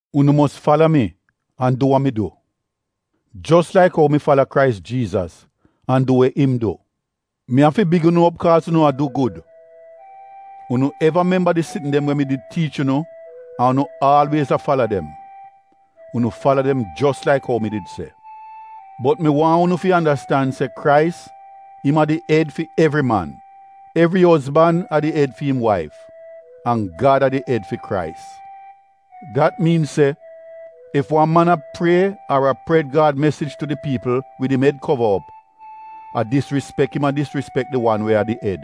Unu mos fala mi, an du wa mi du. Jos laik ou mi fala Krais Jiizas, an du we im du. Mi afi big unu op kaaz unu a du gud. Unu eva memba di sitn dem we mi did tiich unu an unu aalwiez a fala dem. Unu fala dem jos laik ou mi did se. Bot mi waahn unu fi andastan se Krais, im a di ed fi evri man, evri ozban a di ed fi im waif, an Gad a di ed fi Krais. Dat miin se ef wan man a prie ar a pred Gad mesij tu di piipl wid im ed kova op, a disrispek im a disrispek di wan we a di ed.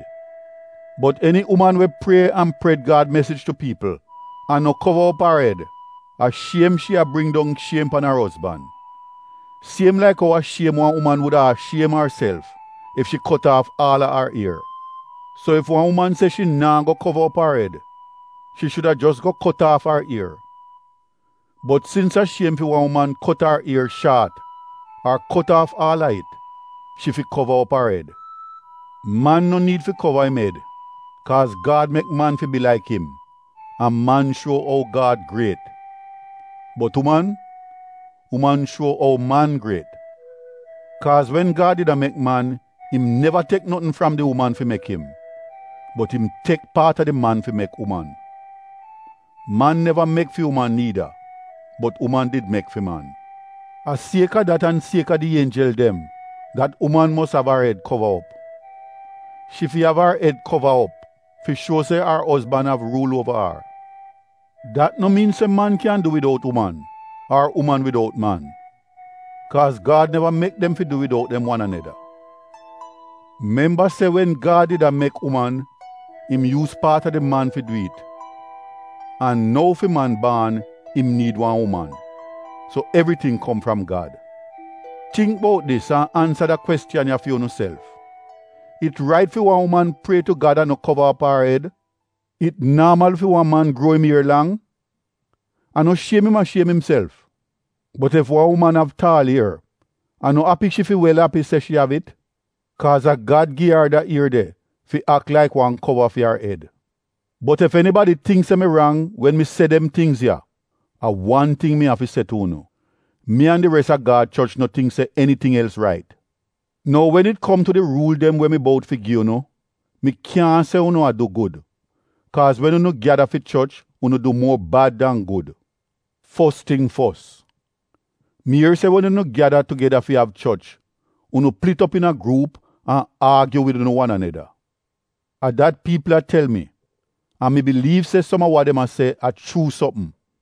Bot eni uman we prie an pred Gad mesij tu piipl an no kova op ar ed, a shiem shi a bring dong shiem pan ar ozban. Siem laik ou a shiem wan uman wuda a shiem arself ef shi kot aaf aal a ar ier. So ef wan uman se shi naa go kova op ar ed, shi shuda jos go kot aaf ar ier. Bot sins a shiem fi wan uman kot ar ier shaat ar kot aaf aal a it, shi fi kova op ar ed. Man no niid fi kova im ed kaaz Gad mek man fi bi laik im an man shuo ou Gad griet. Bot uman, uman shuo ou man griet. Kaaz wen Gad did a mek man im neva tek notn fram di uman fi mek im. Bot im tek paat a di man fi mek uman. Man neva mek fi uman niida, bot uman did mek fi man. A sieka dat an kaaz a di ienjel dem dat uman mos av ar ed kova op. Shi fi av ar ed kova op fi shuo se ar ozban av ruul uova ar. Dat no miin se man kyan du widout uman ar uman widout man, kaaz Gad neva mek dem fi du widout dem wan aneda. Memba se wen Gad did a mek uman im yuuz paat a di man fi du it, an nou fi man baan im niid wan uman. So evriting kom fram Gad. Tingk bout dis an ansa da kwestiyan ya fi unuself: It rait fi wan uman prie tu Gad an no kova op ar ed? It naamal fi wan man gruo im ier lang? A no shiem im a shiem imself? Bot ef wan uman av taal ier, a no api shi fi wel api se shi av it? Kaaz a Gad gi ar da ier de fi ak laik wan kova fi ar ed. Bot ef enibadi tingk se mi rang wen mi se dem tingz ya, a wan ting mi av fi se tu unu — mi an di res a Gad choch no tingk se eniting els rait. Nou wen it kom tu di ruul dem we mi bout fi gi unu, mi kyaahn se unu a du gud, kaaz wen unu gyada fi choch unu du muor bad dan gud. Fos ting fos, mi ier se wen unu gyada tugeda fi av choch unu plit op iina gruup an aagyu wid unu wan aneda. A dat piipl a tel mi an mi biliiv se som a wa dem a se a chuu sopm.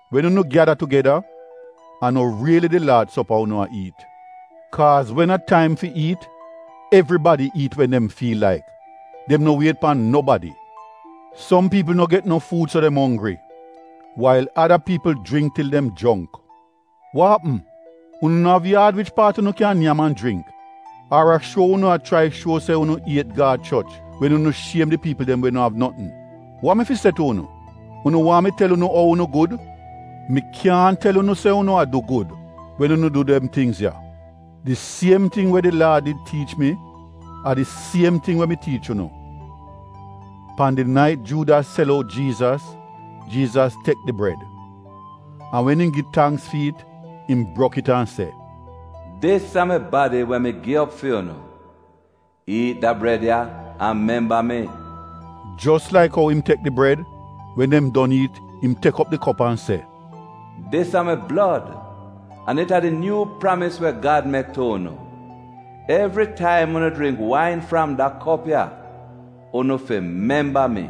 Wen unu gyada tugeda, a no riili di Laad sopa unu a iit. Kaaz wen a taim fi iit, evribadi iit wen dem fiil laik, dem no wiet pan nobadi. Som piipl no get no fuud so dem onggri wail ada piipl jringk til dem jrongk. Wa apm? Unu no av yaad wich paat unu kyan nyam an jringk? Ar a shuo unu a chrai shuo se unu iet Gad choch wen unu shiem di piipl dem we no av notn? Wa mi fi se tu unu? Unu waahn mi tel unu ou unu gud? Mi kyaahn tel unu se unu a du gud wen unu du dem tingz ya. Di siem ting we di Laad did tiich mi a di siem ting we mi tiich unu: pan di nait Juudas sel out Jiizas, Jiizas tek di bred, an wen im gi tangks fi it, im brok it an se, “Dis a mi badi we mi gi op fi unu. Iit da breda ya an memba mi.” Jos laik ou im tek di bred, wen dem don iit im tek op di kop an se, “Dis a mi blod an it a di nyuu pramis we Gad mek tu unu. Evritaim unu jringk wain fram da kop ya, unu fi memba mi.”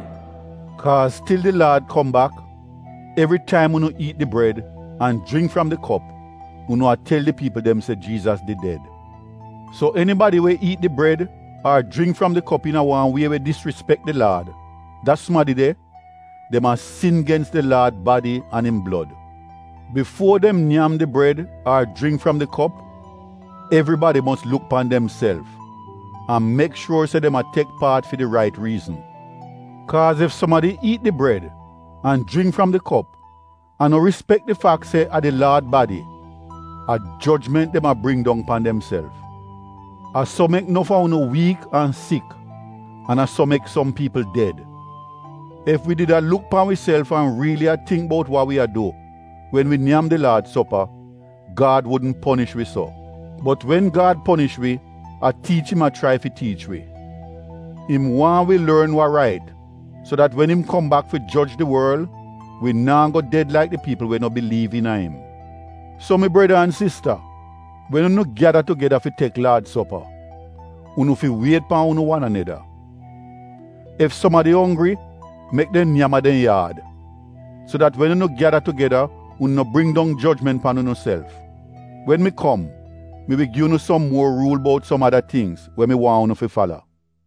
Kaaz til di Laad kom bak, evritaim unu iit di breda an jringk fram di kop, unu a tel di piipl dem se Jiizas did ded. So enibadi we iit di bred ar jringk fram di kop iina wan wie we disrispek di Laad, da sumadi de, dem a sin gens di Laad badi an im blod. Bifuo dem nyam di bred ar jringk fram di kop, evribadi mos luk pan demself an mek shuor se dem a tek paat fi di rait riizn. Kaaz ef sumadi iit di breda an jringk fram di kop an no rispek di fak se a di Laad badi, a jojment dem a bring dong pan demself. A so mek nof a unu wiik an sik an a so som piipl ded. Ef wi did a luk pan wiself an riili a tingk bout wa wi a du wen wi nyam di Laad sopa, Gad wudn ponish wi so. Bot wen Gad ponish wi a tiich im a chrai fi tiich wi. Im waahn wi lorn wa rait so dat wen im kom bak fi joj di worl, wi naa go ded laik di piipl we no biliiv iina im. So mi breda an sista wen unu gyada tugeda fi tek Laad sopa, unu fi wiet pan unu wan aneda. Ef sumadi onggri mek dem nyam a dem yaad, so dat wen unu gyada tugeda unu no bring dong jojment pan unuself. Wen mi kom, mi wi gi unu som muor ruul bout som ada tingz we mi waahn unu fi fala.